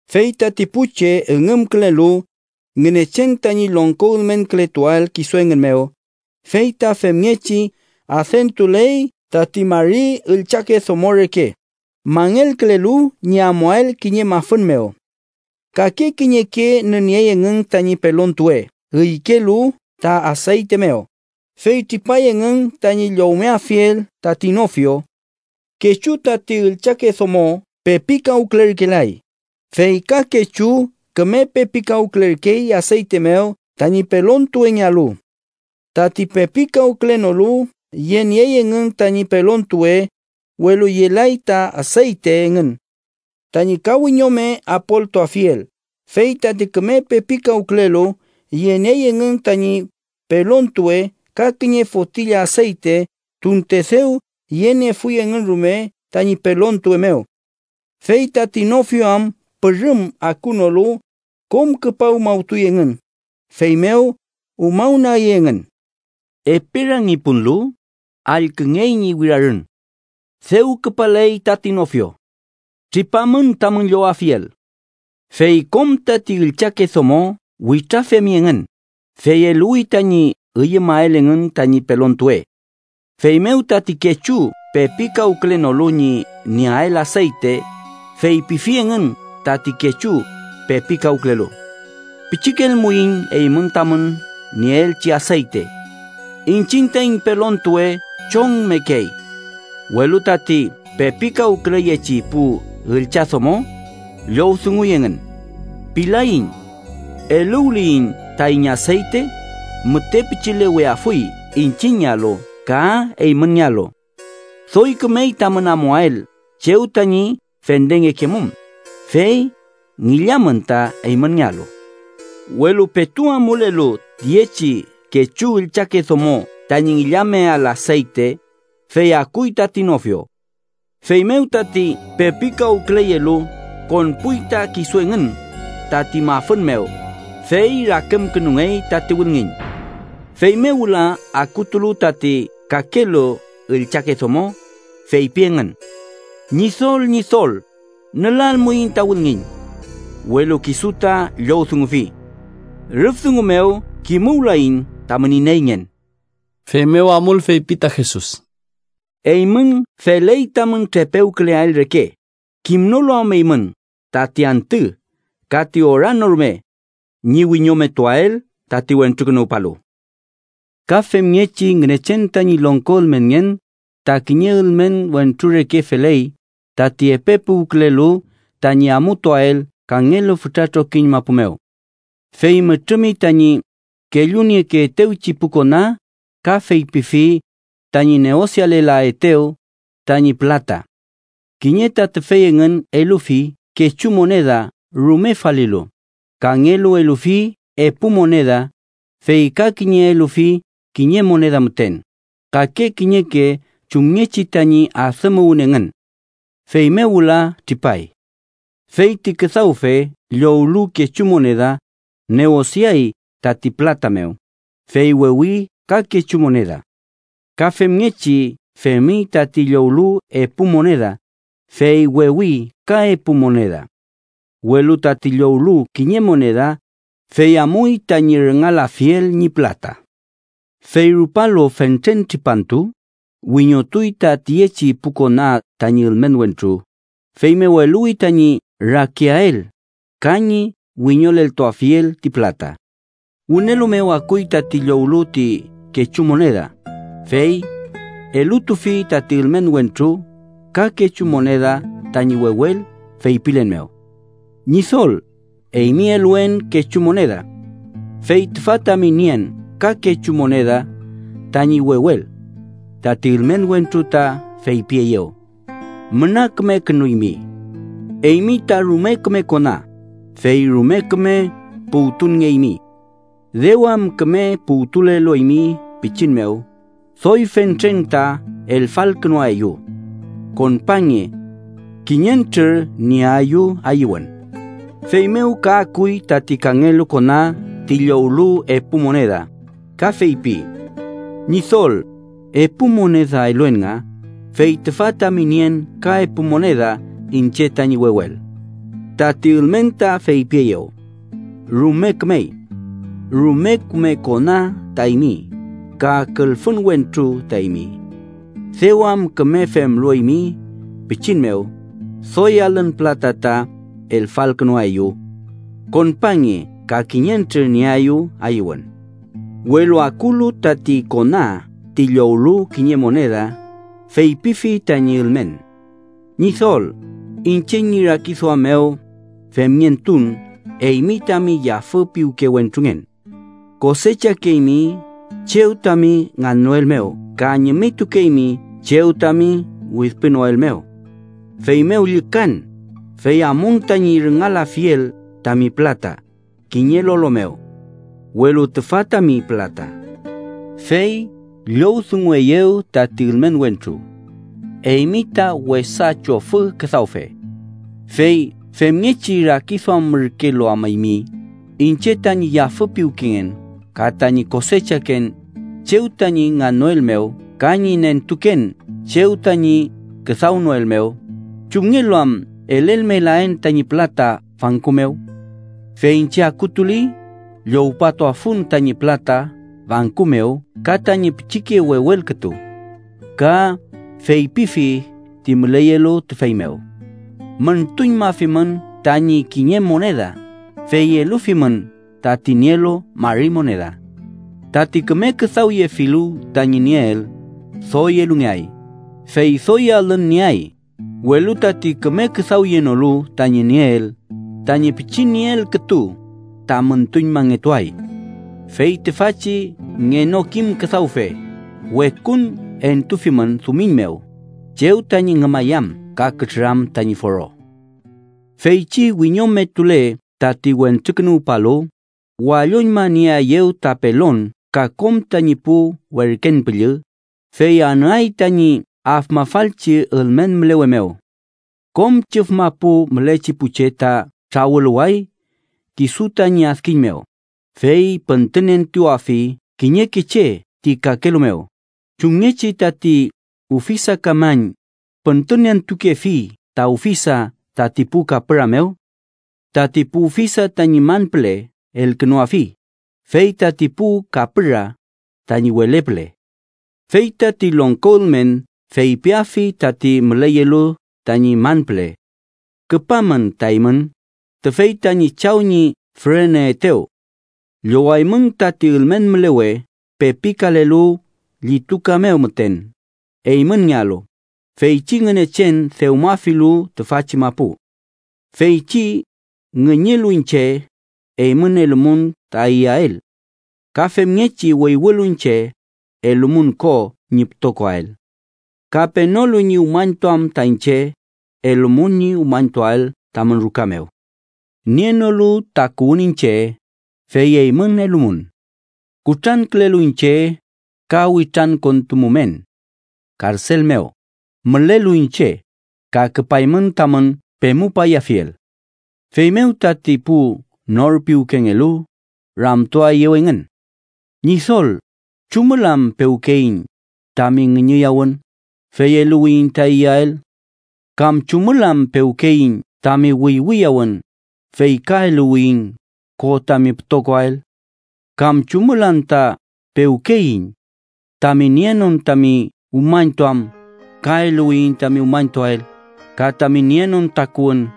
“Fey tati pu che üngümkülelu Ngünechen tañi longko ülmenkületuael kisu engün mew, fey ta femngechi adentuley tati mari üllchake domo reke, mangelkülelu ñi amuael kiñe mafün mew. Kake kiñeke nüniey engün tañi pelontuwe üykelu ta aseyte mew, fey tripay engün tañi llowmeafiel tati nofio. Kechu tati üllchake domo pepikawkülerkelay, fey ka kechu küme pepikawkülerkey aseyte mew tañi pelontuwengealu. Tati pepikawkülenolu yeniey engün tañi pelontuwe, welu yelay ta aseyte engün tañi ka wiñome apoltuafiel. Fey tati küme pepikawkülelu yeniey engün tañi pelontuwe ka kiñe fotilla aseyte, tunte dew yeniefuy engün rume tañi pelontuwe mew. Fey tati nofio am pürüm akunolu, kom küpa umawtuy engün, feymew umawnagi engün. “Epe rangi punlu, allküngey ñi wirarün: ‘¡Dew küpaley tati nofio! ¡Tripamün tamün llowafiel!’ Fey kom tati üllchake domo witrafemi engün, fey eluwi tañi üyümael engün tañi pelontuwe. Feymew tati kechu pepikawkülenolu ñi nieael aseyte feypifi engün tati kechu pepikawkülelu: ‘Pichikelmuiñ eymün tamün nieelchi aseyte. Iñchiñ taiñ pelontuwe chongmekey.’ Welu tati pepikawküleyechi pu üllchadomo llowdunguy engün: ‘Pilaiñ. Eluwliyiñ taiñ aseyte, müte pichileweafuy iñchiñngealu ka eymünngealu. Doy kümey tamün amuael chew tañi fendengekemum, fey ngillamün ta eymünngealu.’ Welu petu amulelu tiyechi kechu üllchake domo tañi ngillameael aseyte, fey akuy tati nofio. Feymew tati pepikawküleyelu konpuy ta kisu engün tati mafün mew, fey rakümkünungey tati wülngiñ. “Feymew wüla akutulu tati kakelu üllchake domo, feypi engün: ‘¡Ñidol, Ñidol, nülalmuiñ ta wülngiñ!’ Welu kisu ta llowdungufi: ‘Rüf dungu mew kimuwlaiñ tamün ineyngen.’” Feymew amul feypi ta Jesus: “Eymün feley tamün trepewküleael reke, kimnolu am eymün tati antü ka ti ora no rume ñi wiñometuael tati Wentrukünuwpalu. “Ka femngechi Ngünechen tañi longko ülmenngen ta kiñe ülmen wentru reke feley tati epe puwkülelu tañi amutuael kangelu fütra trokiñ mapu mew. Fey mütrümi tañi kellunieyeetewchi pu kona ka feypifi tañi neosialaetew tañi pülata. Kiñe ta tüfey engün elufi kechu moneda rume falilu, kangelu elufi epu moneda, fey ka kiñe elufi kiñe moneda müten, kake kiñeke chumngechi tañi adümuwün engün. Feymew wüla tripay. “Fey ti küdawfe llowlu kechu moneda, neosiay tati pülata mew, fey wewi ka kechu moneda. Ka femngechi femi tati llowlu epu moneda, fey wewi ka epu moneda. Welu tati llowlu kiñe moneda, fey amuy tañi rüngalafiel ñi pülata. Fey rupalu fentren tripantu, wiñotuy ta tiyechi pu kona tañi ülmen wentru, feymew eluwi tañi rakiael ka ñi wiñoleltuafiel ti pülata. “Wünelu mew akuy tati llowlu ti kechu moneda, fey elutufi tati ülmen wentru ka kechu moneda tañi wewel feypilen mew: ‘Ñidol, eymi eluen kechu moneda. Fey tüfa tami nien ka kechu moneda tañi wewel.’ Tati ülmen wentru ta feypieyew: ‘Müna kümekünuymi. Eymi ta rume küme kona, fey rume küme puwtunngeymi. Dew am küme puwtulelu eymi pichin mew, doy fentren ta elfalkünuaeyu. Konpange. Kiñentrür nieayu ayüwün.’ “Feymew ka akuy tati kangelu kona ti llowlu epu moneda, ka feypi: ‘Ñidol, epu moneda eluen nga, fey tüfa tami nien ka epu moneda iñche tañi wewel.’ Tati ülmen ta feypieyew: ‘Rume kümey. Rume küme kona ta eymi ka külfün wentru ta eymi. Dew am küme femlu eymi pichin mew, doy alün pülata ta elfalkünuaeyu. Konpange ka kiñentrür nieayu ayüwün.’ “Welu akulu tati kona ti llowlu kiñe moneda, feypifi tañi ülmen: ‘Ñidol, iñche ñi rakiduam mew femngentun eymi tami yafü piwke wentrungen. Kosechakeymi chew tami ngannoel mew ka ñimitukeymi chew tami widpünoel mew. Feymew llükan, fey amun tañi rüngalafiel tami pülata kiñe lolo mew. Welu tüfa tami pülata.’ “Fey llowdungueyew tati ülmen wentru: ‘Eymi ta wesa chofü küdawfe. Fey femngechi rakiduamürkelu am eymi iñche tañi yafü piwkengen ka tañi kosechaken chew tañi ngannoel mew ka ñi nentuken chew tañi küdawnoel mew, ¿chumngelu am elelmelaen tañi pülata banku mew? Fey iñche, akutuli, llowpatuafun tañi pülata banku mew ka tañi pichike wewel kütu.’ Ka feypiyefi ti müleyelu tüfey mew: ‘Müntuñmafimün tañi kiñe moneda, fey elufimün tati nielu mari moneda. Tati küme küdawyefilu tañi nieel, doy elungeay, fey doy alün nieay, welu tati küme küdawyenolu tañi nieel, tañi pichi nieel kütu ta müntuñmangetuay. Fey tüfachi ngenokim küdawfe, wekun entufimün dumiñ mew, chew tañi ngümayam ka kütrüram tañi foro.’ “Feychi wiñometule tati Wentrukünuwpalu, walloñmanieaeyew ta pelon ka kom tañi pu werken püllü, fey anüay tañi afmafalchi ülmen mülewe mew. Kom chüf mapu mülechi pu che ta trawüluway kisu tañi adkiñ mew, fey püntünentuafi kiñeke che ti kakelu mew, chumngechi tati ufisakamañ püntünentukefi ta ufisa tati pu kapüra mew. Tati pu ufisa tañi man püle elkünuafi, fey tati pu kapüra tañi wele püle. “Fey tati longko ülmen feypiafi tati müleyelu tañi man püle: ‘Küpamün ta eymün, tüfey tañi Chaw ñi füreneyeetew. Llowaymün tati ülmen mülewe pepikalelu llituka mew müten eymünngealu, feychi Ngünechen dewmafilu tüfachi mapu. Feychi ngüñülu iñche, eymün elumun ta iyael. Ka femngechi wüywülu iñche, elumun ko ñi pütokoael. Ka penolu ñi umañtuam ta iñche, elumun ñi umañtuael tamün ruka mew. Nienolu takuwün iñche, fey eymün elumun. Kutrankülelu iñche, ka witrankontumumen. Karsel mew mülelu iñche, ka küpaymün tamün pemupayafiel.’ “Feymew tati pu nor piwkengelu ramtuaeyew engün: ‘¿Ñidol, chumül am pewkeyiñ tami ngüñüyawün, fey eluwiyiñ ta iyael? ¿Kam chumül am pewkeyiñ tami wüywüyawün, fey ka eluwiyiñ ko tami pütokoael? ¿Kam chumül anta pewkeyiñ tami nienon tami umañtuam, ka eluwiyiñ tami umañtuael, ka tami nienon takuwün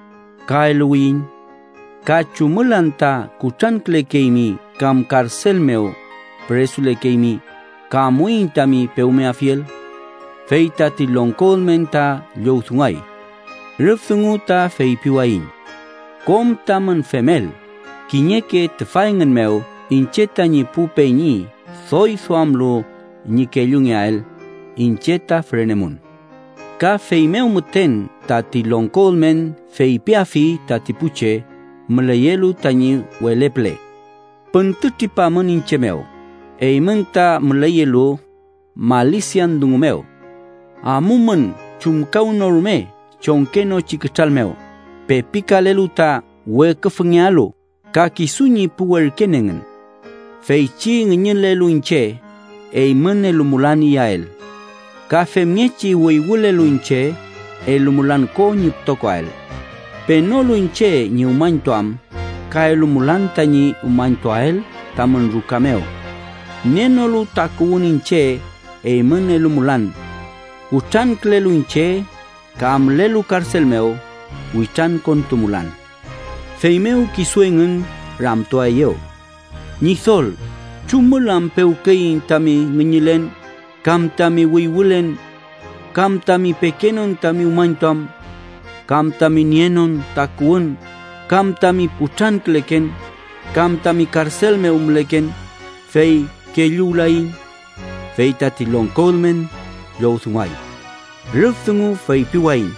ka eluwiyiñ? ¿Ka chumül anta kutrankülekeymi kam karsel mew püresulekeymi, ka amuiñ tami pewmeafiel?’ Fey tati longko ülmen ta llowdunguay: ‘Rüf dungu ta feypiwayiñ kom tamün femel kiñeke tüfa engün mew iñche tañi pu peñi doy duamlu ñi kellungeael, iñche ta fürenemun.’ “Ka feymew müten tati longko ülmen feypiafi tati pu che müleyelu tañi wele püle: ‘Püntütripamün iñche mew, eymün tati müleyelu malisian dungu mew. Amumün chumkawnorume chongkenochi kütral mew pepikalelu ta weküfüngealu ka kisu ñi pu werken engün. Feychi ngüñülelu iñche, eymün elumulan iyael. Ka femngechi wüywülelu iñche, elumulan ko ñi pütokoael. Penolu iñche ñi umañtuam, ka elumulan tañi umañtuael tamün ruka mew. Nienolu takuwün iñche, eymün elumulan. Kutrankülelu iñche, ka mülelu karsel mew, witrankontumulan.’ “Feymew kisu engün ramtuaeyew: ‘Ñidol ¿chumül am pewkeyiñ tami ngüñülen kam tami wüywülen, kam tami pekenon tami umañtuam, kam tami nienon takuwün, kam tami kutranküleken, kam tami karsel mew müleken, fey kelluwlayiñ?’ “Fey tati longko ülmen llowdunguay: ‘Rüf dungu feypiwayiñ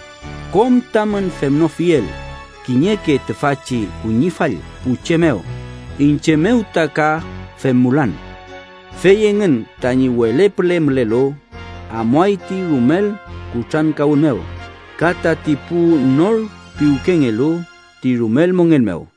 kom tamün femnofiel kiñeke tüfachi kuñifall pu che mew, iñche mew ta ka femmulan.’ “Fey engün tañi wele püle mülelu, amuay ti rumel kutrankawün mew, ka tati pu nor piwkengelu ti rumel mongen mew.”